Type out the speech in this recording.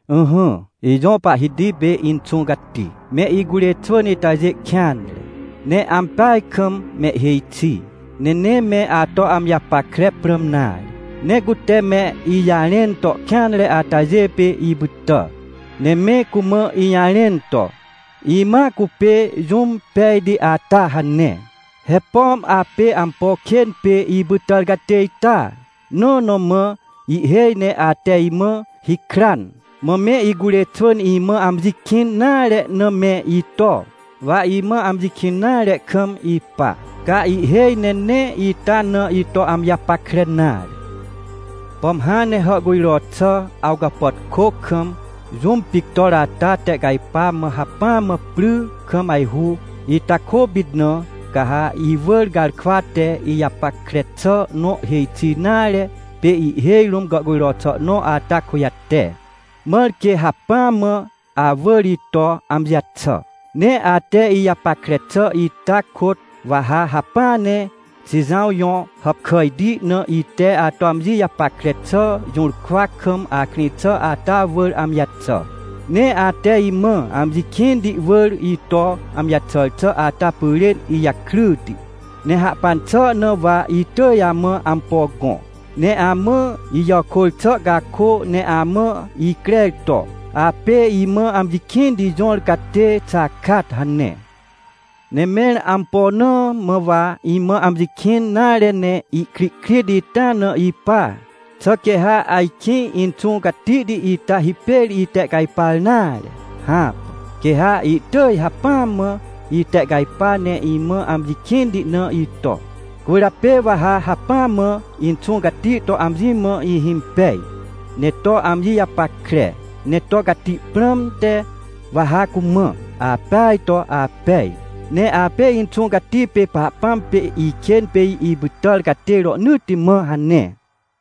Ỹhỹ, ijõ Pahhiti pê Inxũ Cati, me icurê xwỳn itajê kêanre, ne ampeaj kam mehhêj xi, ne nee me ato amji japackre prãm nare. Ne cute me ijarẽn to kêanre atajê pê ipytà. Ne me cumã ijarẽn to: “Imãa cupê jũm pejti ata” hane. He pom apê ampo kên pê ipytàr catê ita? Nõ na mã ihhêj ne ate imã hikran. Mã me icurê xwỳn imã amji kĩn nare na me ito, wa imã amji kĩn nare kam ipa, ca ihhêj ne nee ita na ito amji japackre nare. Pom hãn ne hàhcujro xà, awcapàtkô kam jũm pictor ata tehcajpa mã hacpỹa mã pry kam ajhu, ita kôpit na, ca ha iwỳr garkwa te ijapackre xà nõ hêj xi nare, pê ihhêj rũm gàhcujro xà nõ ata kujate, mãr quê hacpỹa mã awỳr ito amji jaxà. Ne ate ijapackre xà ita kôt, wa ha hacpỹa ne Xijãw jõ hàpkàjti na ite ato amji japackre xà jũrkwa kam akrĩ xà ata wỳr amji jaxà. Ne ate imã amji kĩnti wỳr ito amji jaxàr xà ata pyrên ijakryti, ne hahpan xà na wa itỳj amã ampo gõ. Ne amã ijàkôr xà cakô, ne amã icrer to: “Apê imã amji kĩnti jõr catê xakat” hane. Ne mẽr ampo na mã wa imã amji kĩn nare ne ikrihkrit ita na ipa? Xà quê ha ajkĩ Inxũ Catihti ita hipêr itehcajpar nare? Hãpà! Quê ha ihtỳj hacpỹa mã itehcajpa ne imã amji kĩnti na ito. Cwỳrjapê wa ha hacpỹa mã Inxũ Cati to amji mã ihhimpej, ne to amji japackre, ne to cati prãmte wa ha cumã: “Apeaj to apej. Ne apê Inxũ Cati pê Pahpãm pê ikên pê ipytàr catê rohnỳtti mã” hane.